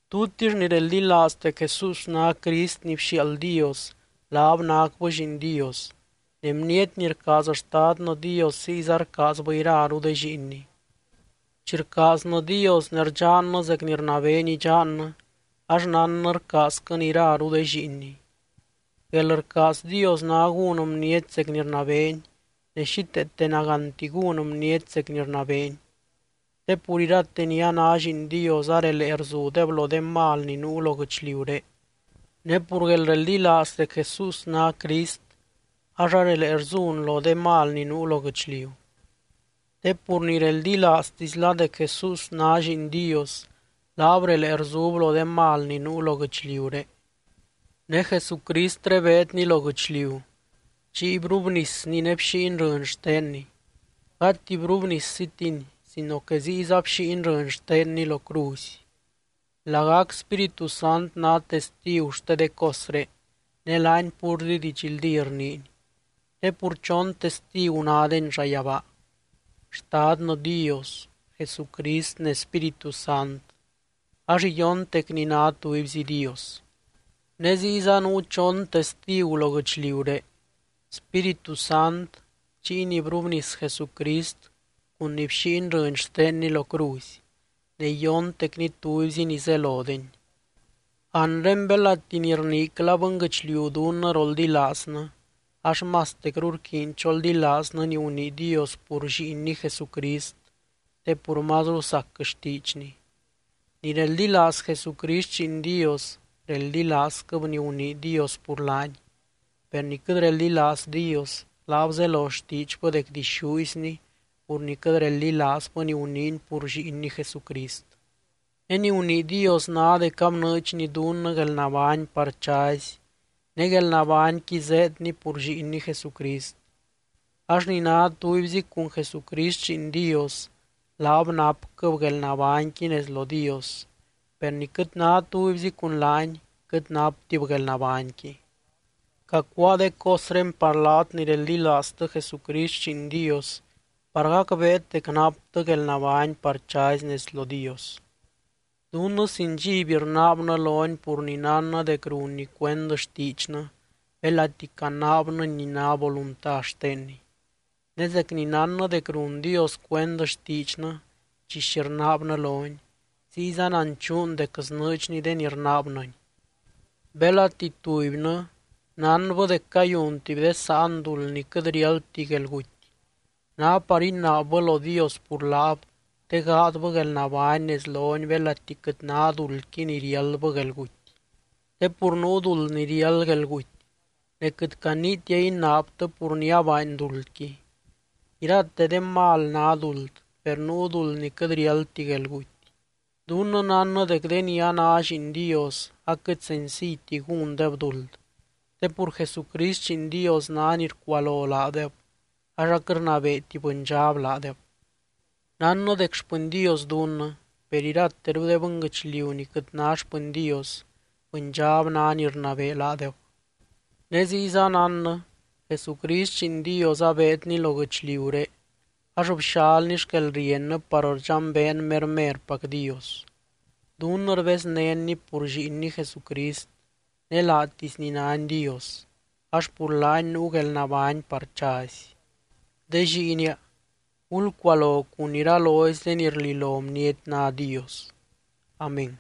Tutix ni reldilaaz dec Jesús ná Crist ni bxiaald Dios, laab nácbɨ lliin Dios. Ne bniety ni rcaaz Xtadnɨ Dios ziyza rcaazbɨ iraru de lliinny. Chi rcaaznɨ Dios ne rdxannɨ zec ni rnabeeny idxannɨ ax nánnɨ rcaazquɨn iraru de lliinny. Guelrcaaz Dios ná gún bniety zec ni rnabeeny, ne xíteete nagánti gún bniety zec ni rnabeeny. Te pur irate ni a ná lliin Dios arelee rzudeb lo de mal ni nuu lo guɨchliuré. Ne pur guelreldilaaz dec Jesús ná Crist ax arelee rzun lo de mal ni nuu lo guɨchliu. Te pur ni reldilaaztisla dec Jesús ná Lliin Dios, laab relee rzub lo de mal ni nuu lo guɨchliuré. Ne Jesucristré beedny lo guɨchliu. Chiy brubnisny ne bxíiny rɨny xtenny, gati brubniszitiny sino que ziyza bxíiny rɨny xtenny lo cruzy. Lagac Spíritu Sant ná testigu xte de cosré ne laany púrzi didxldí rniiny. Te pur chon testigu nádeny llayabaa: Xtadnɨ Dios, Jesucrist ne Spíritu Sant ax iyontecny ná tubyzi Dios. Ne ziyza nuu chon testigu lo guɨchliuré: Spíritu Sant, chiy ni brubnis Jesucrist cun ni bxíiny rɨny xtenny lo cruzy, ne iyontecny tubyzi ni zelodeny. Anre belati ni rniicla bɨnguɨchliu dunnɨ roldilaaznɨ, ax mastecru rquiiny choldilaaznɨ ni gunii Dios pur Lliinny Jesucrist, te pur mazru sac xtiidxny. Ni reldilaaz Jesucrist Lliin Dios, reldilaazquɨb ni gunii Dios pur laany. Per ni quɨt reldilaaz Dios, laab zelo xtiidxbɨ dec dixúizny pur ni quɨt reldilaazbɨ ni guniiny pur Lliinny Jesucrist. Ne ni gunii Dios ná dec abnɨɨdxny dunnɨ guelnabány par chazy, ne guelnabányqui zéedny pur Lliinny Jesucrist. Ax ni ná tubyzi cun Jesucrist Lliin Dios, laab napquɨb guelnabányqui nez lo Dios. Per ni quɨt ná tubyzi cun laany, quɨt naptib guelnabányqui. Cacuáa de cosré par laat ni reldilaaztɨ Jesucrist Lliin Dios par gacbeet dec naptɨ guelnabány par chazy nez lo Dios. Dunnɨ sin dxiby rnaabnɨ lony pur ni nánnɨ dec runny cuend xtiidxnɨ belati canaabnɨny ni ná volunta xtenny. Ne zec ni nánnɨ dec run Dios cuend xtiidxnɨ chi xi rnaabnɨ lony, ziyza nanchuun dec snɨɨdxny de ni rnaabnɨny. Belati tubynɨ nánbɨ dec cayun tuby de sáan duld ni quɨt riáldti guelguty, ná par inaabbɨ lo Dios pur laab te gaadbɨ guelnabány nez lony belati quɨt ná duldqui ni riáldbɨ guelguty. Te pur nuu duld ni riáld guelguty ne quɨt caniitia inaabtɨ pur ni abaany duldqui. Irate de mal ná duld, per nuu duld ni quɨt riáldti guelguty. Dunnɨ nánnɨ dec de ni a ná lliin Dios aquɨt senciyti gúndeb duld. Te pur Jesucrist Lliin Dios ná ni rcualo laadeb ax aquɨt rnabeeti bɨndxab laadeb. Nánnɨ dec xpɨny Dios dunnɨ. Per irateru de bɨnguɨchliu ni quɨt ná xpɨny Dios, bɨndxab ná ni rnabee laadeb. Ne ziyza nánnɨ, Jesucrist Lliin Dios abeedny lo guɨchliuré ax bxalny xquelriennɨ par rdxambeen mermerpac Dios. Dunnɨ rbeznénny pur Lliinny Jesucrist ne laatisny nány Dios, ax pur laany nuu guelnabány par chazy. De lliinia, gulcualo cun iralozy de ni rlilo bniety ná dios. Amén.